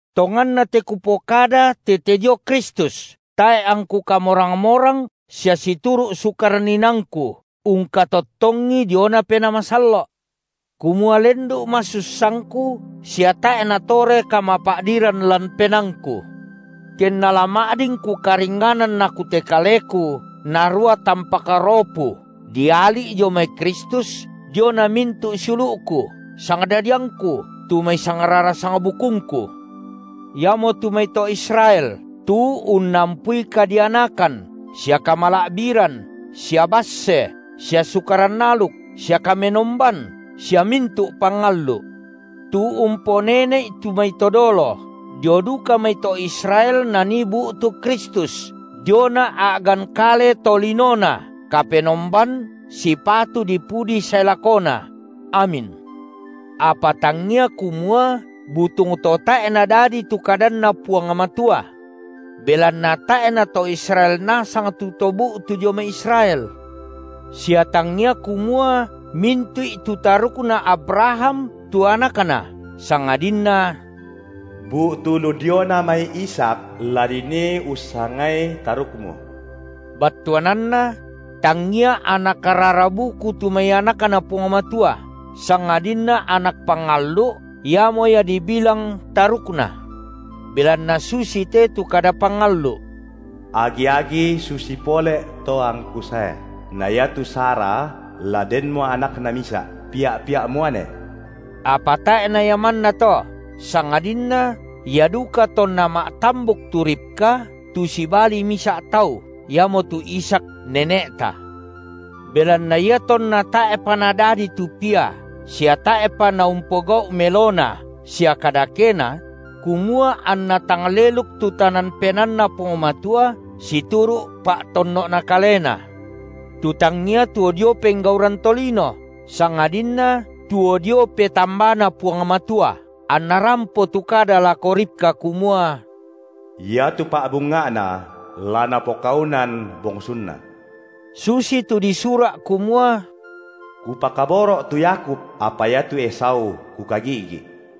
Tonganna te kupokada tete dio Kristus, tae’ angku kamorang-morang sia situru’ Sukaran inaangku ungkatottongi diona Penaa Masallo’, kumua lendu’ masussangku sia tae’ natore kamapa’diran lan penaangku. Kenna la ma’din kukaringnganan aku te kaleku narua tampak ropu diali’ dio mai Kristus diona mintu’ siulu’ku, sangdadiangku tu mai sangrara sangbukungku, iamotu mai to Israel tu unnampui kadianakan sia kamala’biran sia basse sia Sukaran aluk sia kamenomban sia mintu’ pangallu’, tu umponene’i tu mai to dolo, dio duka mai to Israel nanii bu’tu Kristus diona a’gan kale tolinoNa, Kapenomban sipatu dipudi sae lakona! Amin. Apa tangia kumua butung to tae’ nadadi tu kadanNa Puang Matua. Belanna tae’ na to Israel nasang tu to bu’tu dio mai Israel, sia tangia kumua mintu’i tu tarukna Abraham tu anakna, sangadinna: Bu’tu lu diona mai Ishak la dinii ussangai tarukmu. Battuananna: tangia anak rara buku tu mai anakNa Puang Matua, sangadinna anak pangallu’ iamo ia dibilang tarukna. Belanna susite tu kada pangallu’: Agi-agi susi pole’ to angKu sae, na iatu Sara la denmo anakna misa’, pia’-pia’ muane. Apa tae’ na ia mannato, sangadinna ia duka tonna ma’tambuk tu Ribka tu sibali misa’ tau, iamotu Ishak nene’ta. Belanna iatonna tae’pa nadadi tu pia sia tae’pa naumpogau’ melona sia kadakena, – kumua anna tang leluk tu tanan penaanNa Puang Matua situru’ pa’tonno’Na kaleNa, tu tangia tuo dio penggauran tolino, sangadinna tuo dio petambaNa Puang Matua –, anna rampo tu kada lako Ribka kumua: Iatu pa’bunga’na la napokaunan bongsunna, susitu disura’ kumua: Kupakaboro’ tu Yakub, apa iatu Esau Kukagi’gi’.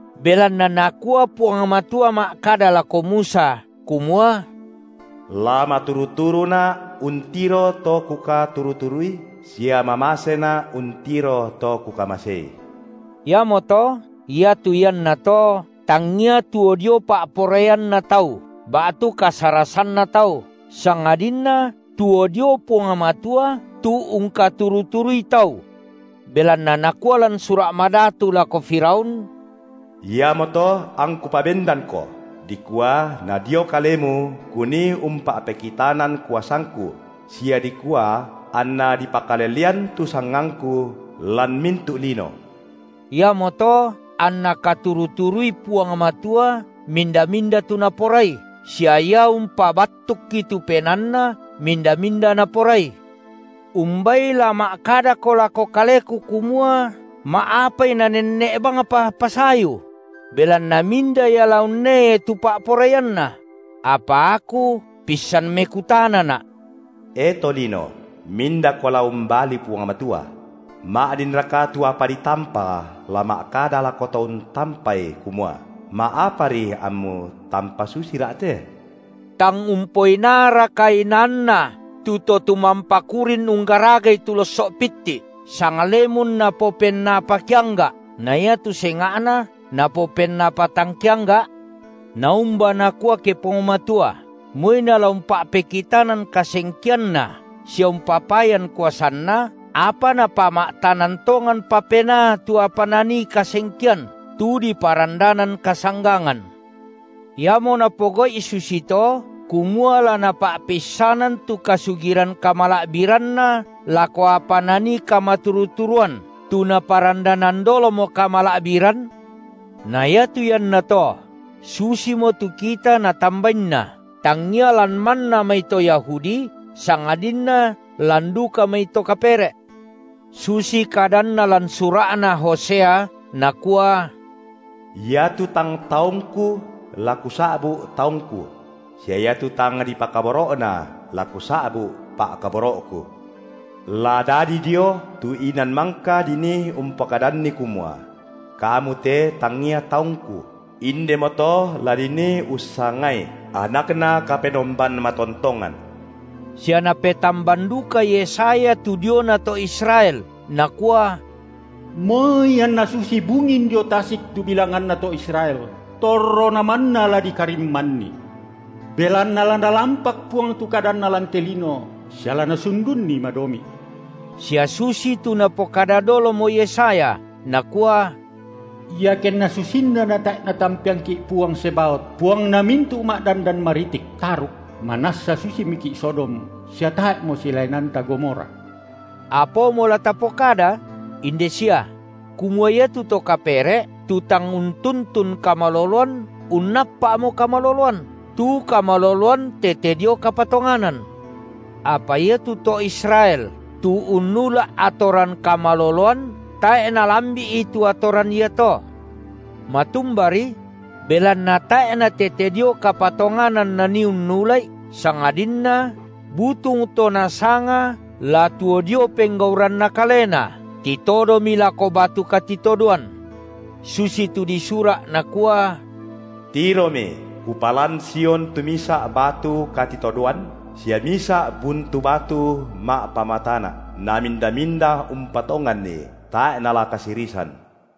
Belanna Nakua Puang Matua ma’kada lako Musa kumua: La maturu-turuNa’ untiro to Kukaturu-turui sia mamaseNa’ untiro to Kukamasei. Iamoto, iatu iannato tangia tuo dio pa’poraianna tau, ba’tu kasarasanna tau, sangadinna tuo dio Puang Matua tu ungkaturu-turui tau. Belanna nakua lan Sura’ Madatu lako Firaun: Iamoto angKu pabendanko, dikua nadio kalemu Kunii umpa’pekitanan kuasangKu sia dikua anna dipakalelean tu sangangKu lan mintu’ lino. Iamoto anNa katuru-turui Puang Matua minda-minda tu Naporai, sia Ia umpabattukki tu penaanna minda-minda Naporai. Umbai la ma’kadako lako kaleku kumua: Ma’apai Nanenne’ bangpa pasayu? Belanna minda ia la unneai tu pa’poraianNa? Apa aku pissan mekutanana’: E tolino, mindako la umbali Puang Matua? Ma’dinraka tu apa ditampa la ma’kada lako to untampai kumua: Ma’apari ammu tampa susira’ te? Tang umpoinaaraka inaanna tu to tumampa kurin unggaragai tu losso’ pitti’, sanglemun napopennapa keangga’ na iatu senga’na napopennapa tang keangga’? Naumba nakua, ke Puang Matua, moi Nala umpa’pekitanan kasengkeanNa sia umpapayan kuasanNa, apa Napama’tanan tonganpa penaa tu apa nanii kasengkean, tu diparandanan kasanggangan. Iamo Napogau’i susito kumua la Napa’peissanan tu kasugiran kamala’biranNa lako apa nanii kamaturu-turuan, tu Naparandanan dolomo kamala’biran? Na iatu iannato susimo tu kita Natambainna, tangia lan manna mai to Yahudi sangadinna lan duka mai to kapere’. Susitu kadanNa lan sura’na Hosea, Nakua: Iatu tang taungKu la Kusa’bu’ taungKu; sia iatu tang dipakaboro’na la Kusa’bu’ pa’kaboro’Ku. La dadi dio tu inan mangka dinii umpokadanni kumua: Kamu te tangia taungKu, indemoto la dinii ussangai anakna Kapenomban matontongan. Sia napetamban duka Yesaya tu diona to Israel nakua: Moi anna susi bungin diong tasik tu bilanganna to Israel, torrona manna la dikarimmanni. Belanna la Nalampak Puang tu kadanNa lan te lino sia la Nasundunni madomi’. Sia susitu napokada dolomo Yesaya, nakua: Iakenna susinna natae’ Natampeangki’ Puang Zebaot (Puangna mintu’ ma’dandan maritik) taruk, manassa susimiki’ Sodom, sia tae’mo silaenanta Gomora. Apaomo la tapokada? Inde sia: kumua iatu to kapere’, tu tang untuntun kamaloloan, unnappa’mo kamaloloan, tu kamaloloan tete dio kapatonganan. Apa iatu to Israel tu unnula’ atoran kamaloloan, tae’ nalambi’i tu atoran iato. Matumbari? belanna tae’ natete dio kapatonganan nanii unnula’i, sangadinna butung to nasanga la tuo dio penggauranna kalena, Titodomi lako batu katitodoan. Susitu disura’ nakua: Tiromi, Kupalan Sion tu misa’ batu katitodoan sia misa’ buntu batu ma’pamatana’, naminda-minda umpatonganni tae’ nala kasirisan.